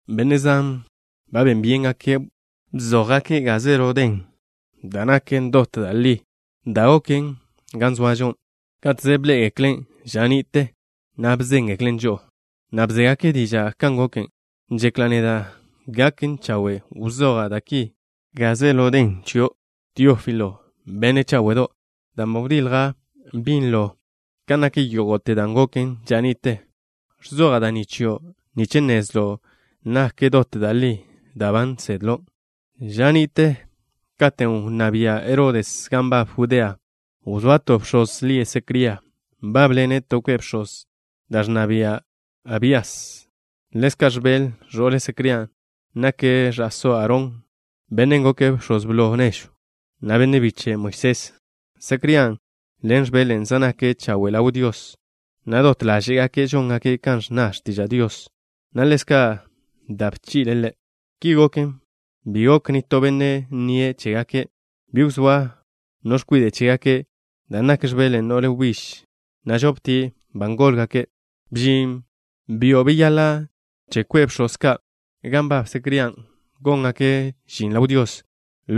Benne' zan ba ben byéngake' bzójgake' gaze ḻo den da' naken dot da' li, dan' goken gan zoažo, káteze bḻé'egeklen' ža ni'te, na' bzéngeklen' žo'o, na' bzégake' diža' kan goken. Žekla' neda' gaken chawe' wzoja' da' ki gaze ḻo den chio', Teófilo, benne' cháwe'do', dan' ba wdilja' binlo kan nak yógo'te dan' goken ža ni'te. Ẕzoja' da' ni chio' nich nnezlo' nak dot da' li da' ba nsedlo'. Ža ni'te katen' wnná bia' Herodes gan nbab Judea, wzóa to bx̱oz lie' Secría. Nbábḻene' to kwe' bx̱oz, da' naken kwe' dan' ẕnna bia' Abías. Ḻezka' X̱bel, ẕo'le Secrían', nake' ẕa'só Aarón, bennen' goke' bx̱oz blo nežw, na' benne' biche' Moisés. Secrían' ḻen X̱belen', zej nake' chawe' ḻaw Dios, na' dot ḻáže'gake' žóngake' kan ẕnna x̱tiža' Dios, na' ḻezka' da' bchi'le' Ḻe'. Ki goken, bi gok nitó benne' nnie' chégake'. Bi wzóa no x̱kwide' chégake', dan' nak X̱belen' no'le wbíž, na' žoptie' ba ngólgake'. Bžin byo' beyaḻa' che kwe' bx̱oz ka' gan nbab Secrían' góngake' žin ḻaw Dios,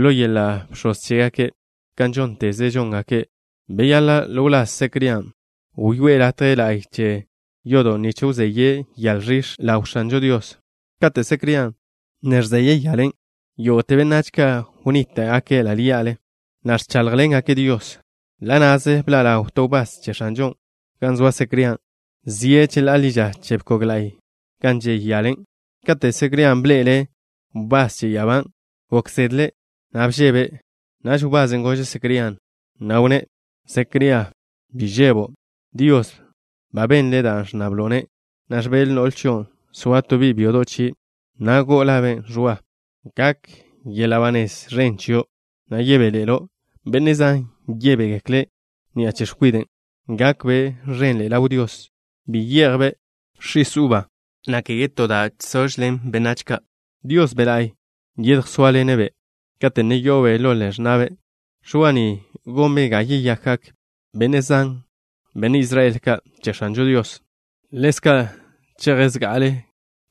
ḻo yeḻa' bx̱oz chégake'. Kan žónteze žongak bx̱oz ka', beyaḻa' ḻo wláz Secrían' wyoé'e latje la'y che yodo' nich wzeye' yale ẕix̱ ḻaw X̱anžo Dios. Kate' Secrían' ne ẕzeye' yalen', yógo'te benách ka' wnníta'gake' ḻa' ḻí'ale, na' ẕcháḻjḻengake' Dios. Ḻa' na'ze bḻa' ḻaw to wbás che X̱anžon' gan zoa Secrían', zie' cheḻá'a ḻi ža che bkog la'y gan žey yalen'. Katen' Secrían' bḻe'ele' wbás che ya'abán', gok zedle', na' bžebe'. Naž wbasen' gože' Secrían', na' wnné': —Secría, bi žebo'. Dios ba benle' da' ẕnnablo'-ne', na' X̱bel, no'le chion', soa to bi' byodo' chie', na' go'o labe' Ẕwa. Gak yeḻa' ba nez ẕen chio', na' yebéḻe'elo'. Benne' zan yebégekle' ni'a che x̱kwiden'. Gakbe' ẕenḻe'e ḻaw Dios. Bi ye'jbe' x̱is uba, na' kege to da' žsožlen benách ka'. Dios Be' La'y yedjsóaḻene'-be' kate' ne yo'obe' ḻo ḻe'e x̱na'be'. Ẕwa ni gonbe' ga yeyakgak benne' zan, benne' Israel ka', che X̱anžo Dios. Ḻezka' cheje' zga'ale'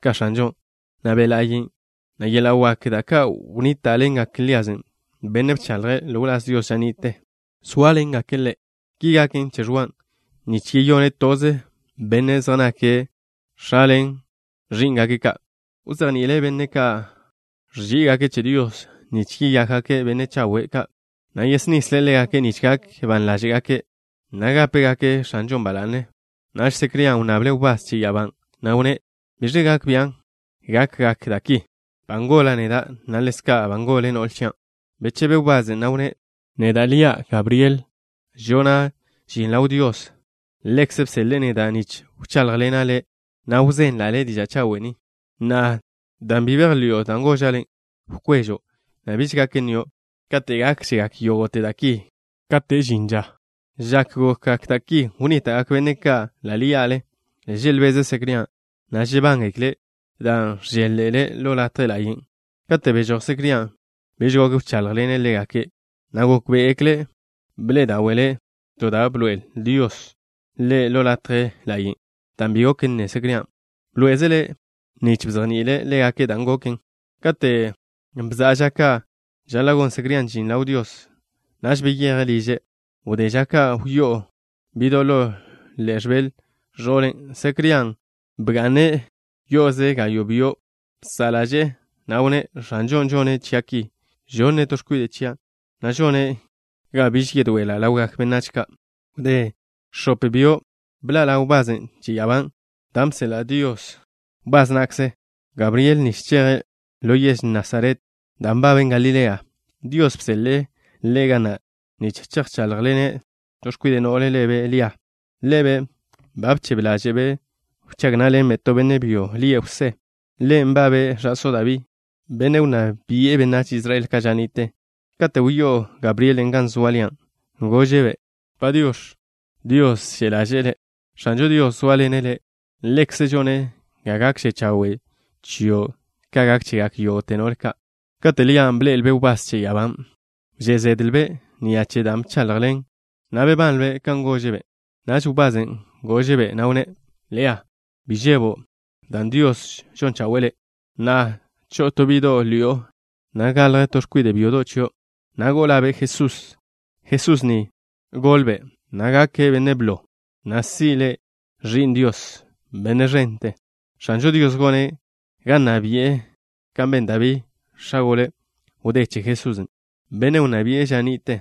ka X̱anžon', na' Be' ḻa'yen', na' yeḻa' waken', da' ka' wnníta'ḻengaken Lías, bennen' bchaḻje' ḻo wláz Dios ža ni'te, sóaḻengaken ḻe'. Ki gaken che Ẕwan' nich yeyone' toze benne' zej nake' x̱a ḻen ẕí'ngake' ka'. Wzejni'ile' benne' ka' ẕží'igake' che Dios, nich yeyákgake' benne' chawe' ka', na' yesnisle' ḻégake' nich gak ban ḻáže'gake', na' gápegake' X̱anžon' ba la'ne. Naž Secrían' wnnable' wbás che ya'abán', na' wnné': —¿Biẕe gak bian' gakgak da' ki? Ba ngola' neda', na' ḻezka' ba ngol no'le chian'. Bechebe wbasen', na' wnné': —Neda' lia' Gabriel. Žona' žin ḻaw Dios. Ḻekze' bseḻe'e neda' nich wcháḻjḻena' le', na' wzenla' le' diža' chawe' ni. Na'a, dan' bi bejḻi'o da' goža' le', wkwežo', na' biž gak nnio' kate' gákžegak yógo'te da' ki, kate' žin ža. X̱ak gokgak da' ki, wnníta'gak benne' ka' ḻa' ḻí'ale, želbeze' Secrían', na' žebángekle' dan' ẕžél-ḻe'ele' ḻo latje ḻa'yen'. Kate' bežój Secrían', bi gok wcháḻjḻene' ḻégake', na' gókbe'egekle' bḻe'e dáwe'le' to da' bḻoe'el Dios ḻe' ḻo latje ḻa'yen'. Dan' bi gok nne Secrían', bḻoé'ezele' nich bzejni'ile' ḻégake' dan' goken. Kate' bza'a ža ka' žaḻa' gon Secrían' žin ḻaw Dios, naž beyeje' liže'. Wdé ža ka' wyó'o bi'do' ḻo ḻe'e X̱bel, ẕo'le Secrían', na' bga'ne' yo'oze gayo' byo'. Bsa' ḻaže'e, na' wnné': —X̱anžon' žone' chia' ki. Žonne' to x̱kwide' chia', na' žone' ga biž yedoe'ela' ḻawgak benách ka'. Wdé x̱op byo', bḻa' ḻaw wbasen' che ya'abá, dan' bseḻa' Dios wbás na'kze', Gabriel, nich cheje' ḻo yež Nasaret, dan' nbaben Galilea. Dios bseḻe'e ḻe' ga na', nich chejcháḻjḻene' to x̱kwide' no'le lebe' Lia. Ḻebe' ba bchebe ḻáže'be' wchág ná'ḻenbe' to benne' byo lie' Jwsé. Ḻe' nbabe' ẕa'só Dabí, bennen' wnná bi'e benách Israel ka' ža ni'te. Kate' wyó'o Gabrielen' gan zoa Lian', gože'-be': —Padiox̱. Dios že' ḻaže'e le'. X̱anžo Dios zóaḻene' le'. Ḻekze' žone' ga gakže chawe' chio' ka gak chegak yógo'te no'le ka'. Kate' Lian' bḻe'elbe' wbás che ya'abán', wžé' zedlbe' ni'a che dan' bchaḻjen', na' bebanlbe' kan gože'-be'. Naž wbasen' gože'-be', na' wnné': —Lia, bi žebo', dan' Dios žon chawe'e le'. Na'a, cho'o to bi'do' ḻi'o, na' galj to x̱kwide' byodo' chio', na' go'o labe' Jesús. Jesús ni golbe', na' gake' benne' blo, na' si' le' Ẕi'n Dios, Benne' ẕente. X̱anžo Dios gone' ga nna bi'e kan ben Dabí, x̱a gole wdé che Jesusen', bennen' wnná bi'e ža ni'te.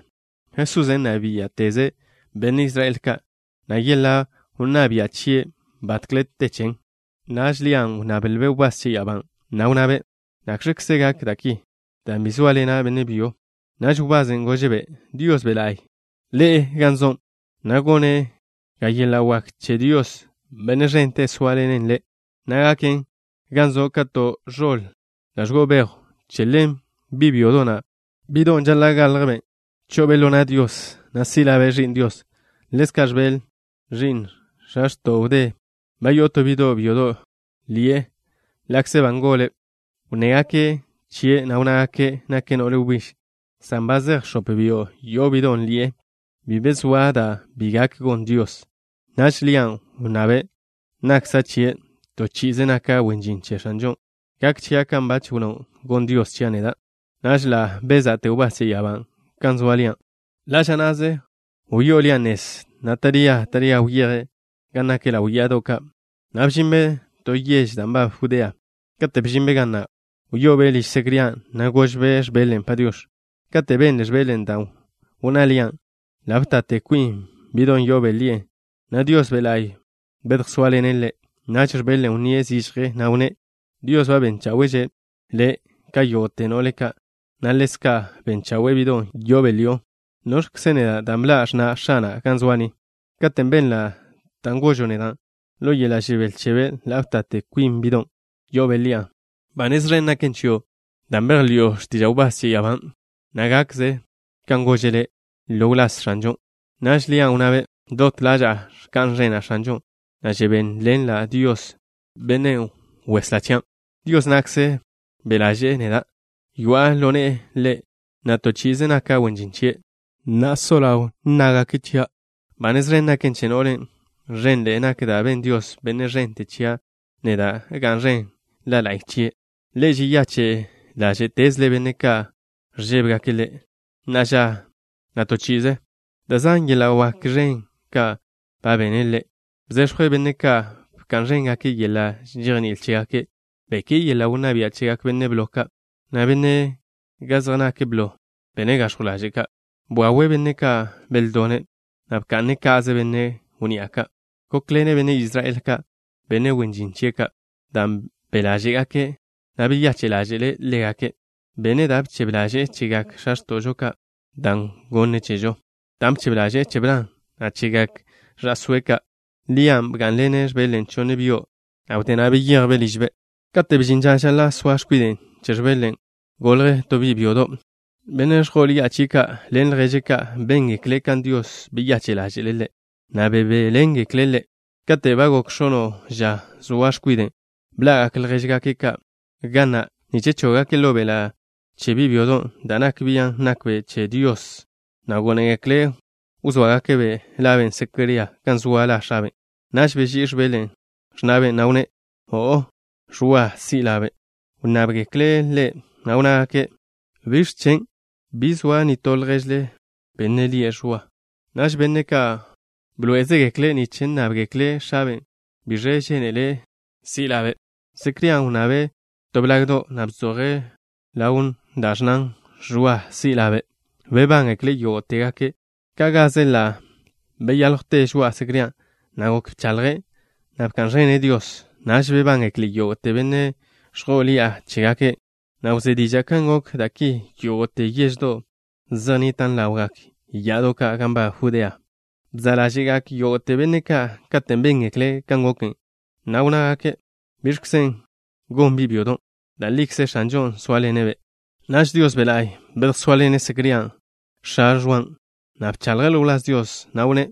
Jesusen' nna biá'teze' benne' Israel ka', na' yeḻa' wnná bia' chien' batkle te chen. Naž Lian' wnnablbe' wbás che ya'abán', na' wnnabe': —¿Nakx̱kze gak da' ki, dan' bi zóaḻena' benne' byo? Naž wbasen' gože'-be': —Dios Be' La'y ḻe'e gan zo', na' gone' ga yeḻa' wak che Dios, Benne' ẕente, sóaḻenen le', na' gaken gan zo' ka to ẕoḻ da' ẕgo'o bejw. Che ḻen bi' byodo' na', bi'don' žaḻa' galjbe', cho'obe' ḻo na' Dios, na' si' labe' Ẕi'n Dios. Ḻezka' X̱bel, ẕi'n x̱a x̱to'o wdé, ba yo'o to bi' byodo' ḻi'e ḻa'kze ba ngole'. Wnnégake' chie', na' wnnágake': “Nake' no'le wbíž” san ba zej x̱op byo' yo'o bi'don' ḻi'e. Bi be zoa da' bi gak gon Dios. Naž Lian' wnnabe': —Nakkza' chie'. To chi'ize naka' wen žin che X̱anžon'. Gak chia' kan bach wnnó' gon Dios chia' neda'. Naž ḻa' beza'te wbás che ya'abán' gan zoa Lian'. Ḻa' ža na'ze wyó'o Lia nez, na' taría taría wyejbe' gan nak ḻaw ya'ado' ka', na' bžinbe' to yež da' nbaben Judea. Kate' bžinbe' ga na' wyo'obe' liž Secrían', na' gožbe' X̱belen': “Padiox̱.” Kate' benle X̱belen' dan' wnná Lian', ḻa' btate kwin bi'don' yo'obe' ḻi'e, na' Dios Be' La'y bedjsóaḻene' ḻe'. Naž X̱belen' wnníe' zižje, na' wnné': —Dios ba ben cháwe'že' le' ka yógo'te no'le ka', na' ḻezka' ben chawe'e bi'don' yo'obe' ḻi'o. ¿Noẕkze neda', dan' bḻa' x̱na' X̱ana' ga zoa' ni? Katen' benla' dan' gožo' neda', ḻo yeḻa' žebél chebe' ḻa' btate kwin bi'don' yo'obe' ḻi'a. Ba nez ẕen naken chio' dan' bejḻi'o x̱tiža' wbás che ya'abán', na' gakkze kan gože' le' ḻo wláz X̱anžon'. Naž Lian' wnnabe': Dot ḻaža'a ẕka'n ẕena' X̱anžon', na' žebéḻenla' Dios, Benne' Weslá chian'. Dios na'kze be' ḻaže'e neda'. Yoa'a ḻo ne'e Ḻe', na' to chi'ize naka' wen žin chie'. Na'a so ḻaw, nnágake' chia': “Ba nez ẕen naken che no'len'.” Ẕenḻe'e nak da' ben Dios, Benne' ẕente, chia' neda'. ¡Ga'n ẕen La la'y chie'! Ḻe' žeyache' ḻáže'tezle' benne' ka' ẕžébegake' Ḻe', na'a ža, na' to chi'ize. Da' zan yeḻa' wak ẕen ka' ba bene' Ḻe'. Bzex̱jwe' benne' ka' bka'n ẕéngake' yeḻa' žejní'il chégake'. Beké'e yeḻa' wnná bia' chegak benne' blo ka', na' bene' ga zej nak blo benne' gax̱jw ḻaže' ka'. Bwawe' benne' ka' beldone', na' bka'ne' ka'ze benne' wnni'a ka'. Gókḻene' benne' Israel ka', benne' wen žin chie' ka', dan' be' ḻaže'e ḻégake', na' beyache' ḻáže'le' ḻégake'. Bene' da' bchebe ḻaže'e chegak x̱a x̱to'žo ka', dan' gone' chežo, dan' bchebe ḻaže'e che Bran, na' chegak ẕa'sóe' ka'. Lian' bgá'nḻenbe' X̱belen' chonne byo', na' wdé na' beyejbe' ližbe'. Kate' bžin ža žaḻa' soa x̱kwide' che X̱belen', golj to bi' byodo'. Benne' ẕjo'o ḻi'a chie' ka' ḻen lježe' ka', béngekle' kan Dios beyache' ḻáže'le' ḻe', na' bebéḻengekle' ḻe'. Kate' ba gok x̱ono' ža zoa x̱kwiden', bḻa'gak ljéžgake' ka' ga na' nich chóggake' ḻo beḻa' che bi' byodon' da' nak bian' nbabbe' che Dios, na' gónegekle' wzóagake' labe' Secría kan zoa la x̱abe'. Naž beží'i X̱bel, x̱na'be', na' wnné': —O'o. Ẕwa si' labe'. Wnnábgekle' ḻe', na' wnnágake': —¿Biẕ chen'? Bi zoa nitó lježle, benne' lie' Ẕwa. Naž benne' ka' bḻoé'ezegekle' nich nnábgekle' x̱abe' biẕe žénele' si' labe'. Secrían' wnnabe' to blagdo', na' bzoje' ḻawn da' ẕnnan: “Ẕwa si' labe'.” Bebángekle' yógo'tegake'. Ka' gaze ḻa' beyáljwte žoa'a Secrían', na' gok bechaḻje', na' bka'n ẕene' Dios. Naž bebángekle yógo'te benne' ẕjo'o ḻi'a chégake', na' wzé diža' kan gok da' ki yógo'te yeždo' zej nnitan' ḻawgak ya'ado' ka' gan nbab Judea. Bza' ḻáže'gak yógo'te benne' ka' katen' béngekle' kan goken, na' wnnágake': —¿Biẕkzen' gon bi' byodon'? Da' likze X̱anžon' zóaḻene'-be'. Naž Dios Be' La'y bedjsóaḻene' Secrían', x̱a Ẕwan', na' bchaḻje' ḻo wláz Dios, na' wnné':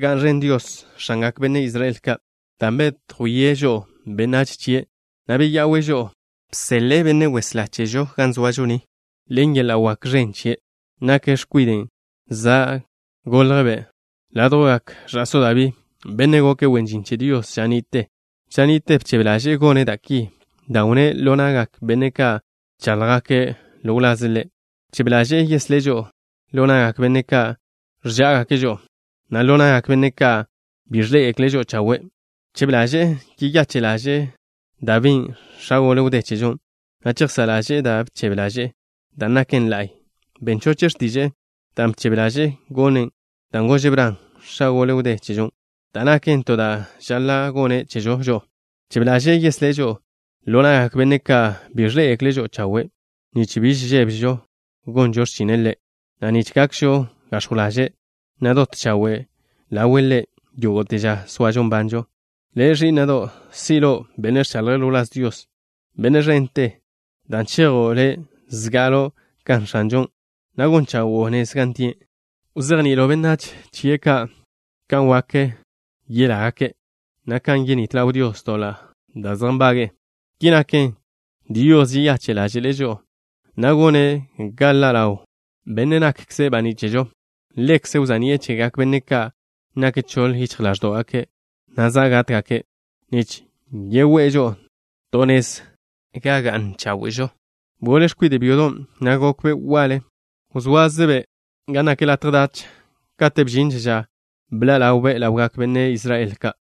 ¡Ga'n ẕen Dios, X̱angak benne' Israel ka', dan' bedjwíe' žo'o, benách chie', na' beya'we' žo'o! Bseḻe'e Benne' Weslá chežo ga zoažo ni, ḻen yeḻa' wak ẕen chie'. Nake' X̱kwiden' za' goljbe' ládjwgak ẕa'só Dabí, bennen' goke' wen žin che Dios ža ni'te. Ža ni'te bchebe ḻaže'e gone' da' ki, dan' wnné' ḻo na'gak benne' ka' bcháḻjgake' ḻo wlaze' Ḻe'. Bchebe ḻaže'e yeslé' žo'o ḻo na'gak benne' ka' ẕžá'agake' žo'o, na' ḻo na'gak benne' ka' bi ẕḻé'egekle' žo'o chawe'. Bchebe ḻaže'e yeyache' ḻáže'le' Dabín', x̱a gole wdé chežon', na' chejsá' ḻaže'e da' bchebe ḻaže'e, dan' naken la'y. Ben choche' x̱tiže'e, dan' bchebe ḻaže'e gonen', dan' gože' Bran, x̱a gole wdé chežon', dan' naken to da' žaḻa' gone' chežo žo'o. Bchebe ḻaže'e yeslé' žo'o ḻo na'gak benne' ka' bi ẕḻé'egekle' žo'o chawe' nich biž žébežo gonžo x̱chine' Ḻe', na' nich gakžo gax̱jw ḻaže', na' dot chawe' ḻawe' Ḻe' yógo'te ža soažo nbanžo. Le', ẕí'na'do', si' lo' benne' ẕchaḻje' ḻo wláz Dios, Benne' ẕente, dan' chejo' le' zga'alo' ka X̱anžon', na' gon chawo'o nez gan tie'. Wzejni'ilo' benách chie' ka' kan wak yelágake' na' kan yenít ḻaw Dios doḻa' da' zej nbage'e. Ki naken, Dios žeyache' ḻáže'le' žo'o, na' gone' ga ḻa' ḻaw Bennen' nakkze' baní' chežo. Ḻekze' wza'ni'e chegak benne' ka' nak choḻ yichj ḻáẕdo'gake', na' za' gátgake', nich yegoé'e žo'o to nez gan ga'n cháwe'žo. Bgole x̱kwide' byodon', na' gokbe' waḻe. Wzóazebe' gan nak latje dach kate' bžinže ža bḻa' ḻawbe' ḻawgak benne' Israel ka'.